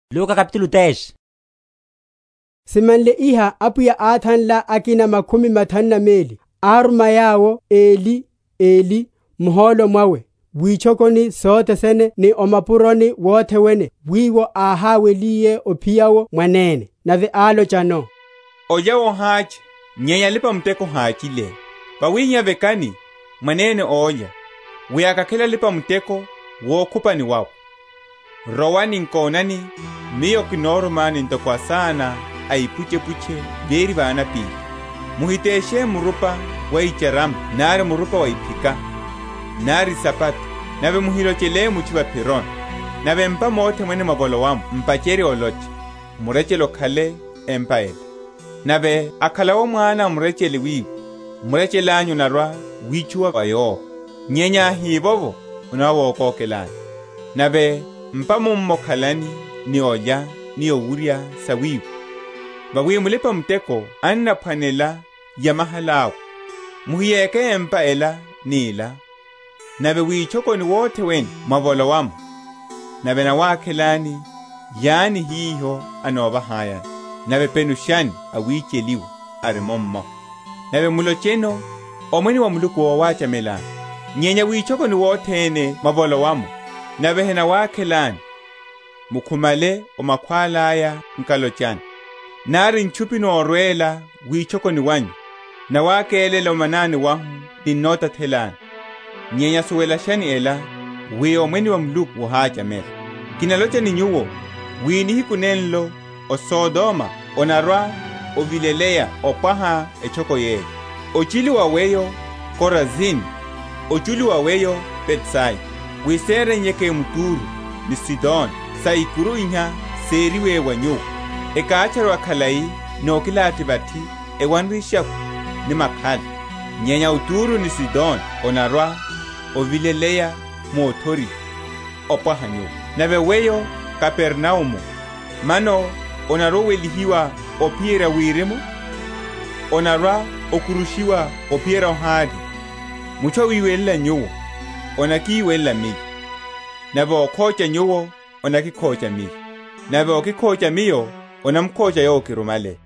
Orummwa wa óhuserya makhumi mathanu na meli. Simanle iha Apwiya áthanla akina makhumi mathanu na meli, áruma yawo eli eli muhólo mwawe witchokoni sothe sene ni o mapuroni wothe wene wiwo áháweliye ophiya’wo mwanene. Nave álochano, Olya wohácha, nyenya alipa‐muteko háchile; wawihihá vekani mwanene olya, wi akakhele alipa‐muteko wukhupani wawe. Rowani; nkonani, Miyo kinorumani ntoko asana a ipuchepuche véri va anapíli. Muhiteshe murupa wa icharama nari murupa wa iphika, nari isapato; nave muhilochele mutchu va’phironi. Nave m’pa mothe mwene mwavolowa’mo m’pacherye olocha, Murechele okhale o empa ela. Nave akhala’wo mwana a murechele wiwo, murechele anyu onarwa‐witchuwa va yowo; nyenya áhivovo, onarwa‐wokokelani. Nave m’pa mummo khalani, ni olya ni owurya sa wiwo; vawi mulipa‐muteko anaphwanela yamahala’we; muhiyéke empa ela ni ela. Nave mwitchokoni mothe mwene mwavolowa’mo, nave enawakhelani, lyani hiho enovahayani; nave penushani awicheliwa ari mummo, nave mulocheno, Omwene wa Muluku wowachamelani. Nyenya witchokoni wothe wene mwavolowa’mo, nave henawakhelani, mukhumale o makhwála’ya nkalochani, Nari ntchupi norwela witchokoni wanyu, nawakélela o manani wahu ninnotathelani, nyenya suwelashani ela, wi Omwene wa Muluku wohachamela. Kinalocha ni nyuwo wi nihiku nenlo o Sodoma onarwa‐ovileleya opwaha etchoko yeyo. Ochilu wa weyo, Korazini! ochilu wa weyo Betsaida! wi séreiyeke m’Turo, ni Sidoni, saikuru iha seriwe wa nyuwo, ekátcharuwa khalai ni okilathi vathi ewanre eshakhwi ni makhala. Nyenya o Turo ni Sidoni onarwa‐ovileleya mu othoriha, opwaha nyuwo. Nave weyo, Kapernaumu, mano onarwa‐owelihiwa ophiyerya wirimu? Onarwa‐okurushiwa ophiyerya o Hade. Mutchu awiwelela nyuwo, anaki?-?welela Miyo; nave ókhocha nyuwo, anakikhocha Miyo; nave ókikhocha Miyo anamukhocha Yowo ákirumale.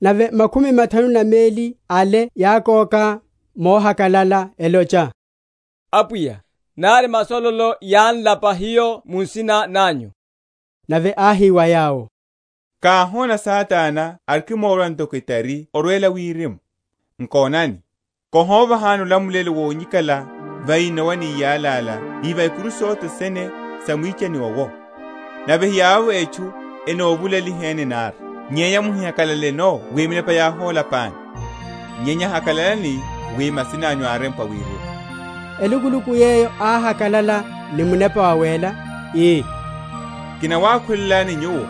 Nave makhumi mathanu na meli ale yákóka mohakalala, elocha, Apwiya, nari masololo yán’lapa hiyo mu nsina nanyu. Nave áhi wa yawo, Káhóna Satana arikimmora ntoko etari orwela wirimu. Nkonani, kihovahani olamulelo wonyikala va inowa ni iyalala ni va ikuru sothe sene sa mwichani owo; nave hiyawowo etchu enovulaliheni nari. Nyenya muhihakalaleno wi minepa yáhólapani, nyenya hakalalani wi masina’nyu árempwa wirimu. Elukuluku yeyo áhakalala ni Munepa Wawéla, ii, Kinawakhulelani Nyuwo,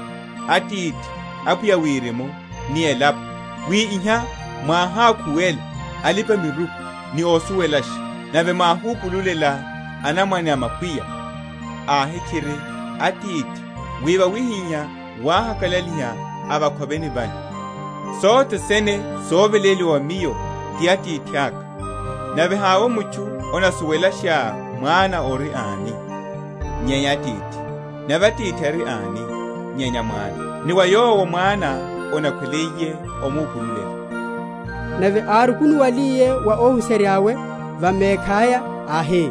Atithi, Apwiya a wirimu ni elapo, wi iha mwáhákhuwela alipa‐miruku ni osuwelasha, nave mwáhupululela anamwane a makwiya; Ahe, tchiri, Atithi, wi wawihihá wáhakalaliha va’khoveni vanyu. Sothe sene soveléliwa wa Miyo ti Atithaka; nave havovo mutchu anasuwelasha Mwana ori ani, nyenya Atithi; nave Atithi ari ani, nyenya Mwana, ni wa yowo Mwana anakhweliye omupululela. Nave árukunuwaliye wa óhuserya’we, va mekhaya áhi,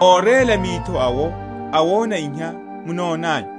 Óréla mitho awo awona iha munonanyu.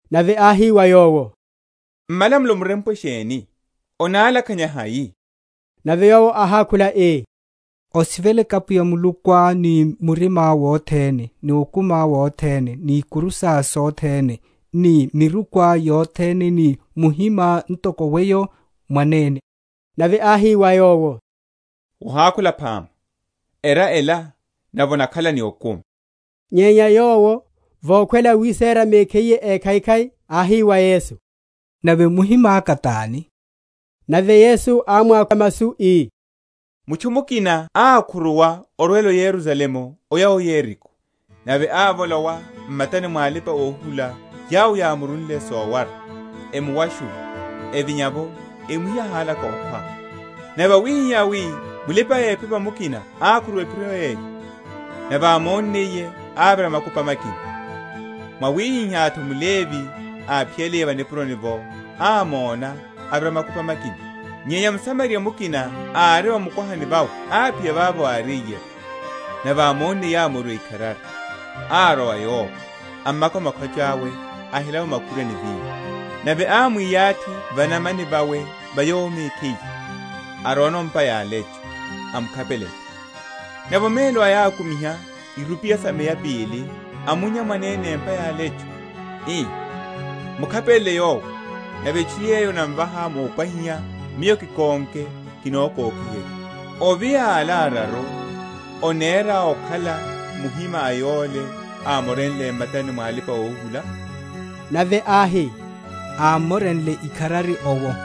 Nave áhi wa yowo, M’malamulo murempwe sheni? Onalakhanya hai? Nave yowo áhákhula ii, Osiveleke Apwiya Mulukuá ni murimá wothene, ni okumiá wothene, ni ikuru sá sothene, ni mirikuá yothene, ni muhimá ntoko weyo mwanene. Nave áhi wa yowo, Wohakhula phama; era ela, nave onakhala ni okumi. Nyenya yowo, vokhwela wisera mekhiye ékhaikhai, áhi wa Yesu, Nave muhimaka tani? Nave Yesu ámwákha masu, ii, Mutchu mukina ákhuruwa orwela o Yerusalemu oya o Yeriko; nave ávolowa m’matani mwa alipa‐ohuhula yawo yámurunle sowara, emuwashula, evinya’vo emuhiyale aháwelaka okhwa. Nave wáhihihá wi mulipa‐ephepa mukina ákhuruwa ephiro yeyo, nave ámonniye ávira makupa makina. Mwawihihá’tho mLevi, áphiyaliye va nipuroni’vo, ámóna, avira makupa makina. Nyenya mSamariya mukina ari va mukwahani vawe áphiya vavo áriye’vo; nave ámonniye, ámoriwa ikharari, arwa wa yowo, amaka makhwacha’we ahela’vo makhurwa ni vinyo; nave ámwiyathi va’namani vawe ya yowo mekhiye, arwano o’mpa ya alecho, amukhapelela. Nave omelo aya ákumiha irupiya sa meya pili amunnya mwanene empa ya alecho, ii, Mukhapelele yowo, nave etchu yeyo onamvahá mopwahiha, miyo, kikónke, kinokokiherya. Ovi a ala araru, onerá akhala muhima a yole ámorenle m’matani mwa alipa‐ohuhula? Nave áhi, Ámmorenle ikharari owo.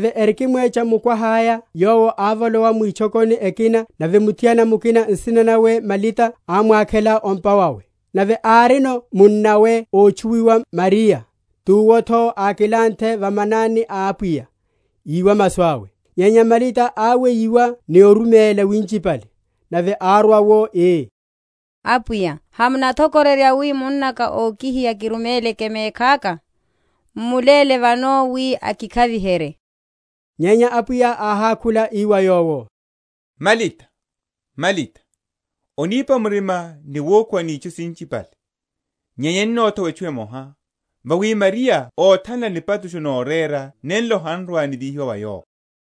Nave erikimwecha mukwaha’ya Yowo ávolowa mwitchokoni ekina; nave muthiana mukina nsina nawe Malita ámwakhela o’mpa wawe. Nave árino munnawe ótchuwiwa Mariya, tuwo’tho ákilanthe va manani a Apwiya, iwa masu awe. Nyenya Malita áweyiwa ni oruméla winchipale; nave árwa’wo ii, Apwiya, Hamunathokororya wi munnaka okihiya kiruméleke mekhaka? M’muléle vano wi akikhaviherye. Nyenya Apwiya áhákhula ii wa yowo, Malita, Malita, onípa murima ni wukhuwa ni itchu sinchipale; nyenya enathowa etchu emoha; vawi Mariya áthanla nipatusho norera nenlo han’rwa‐nivíhiwa wa yowo.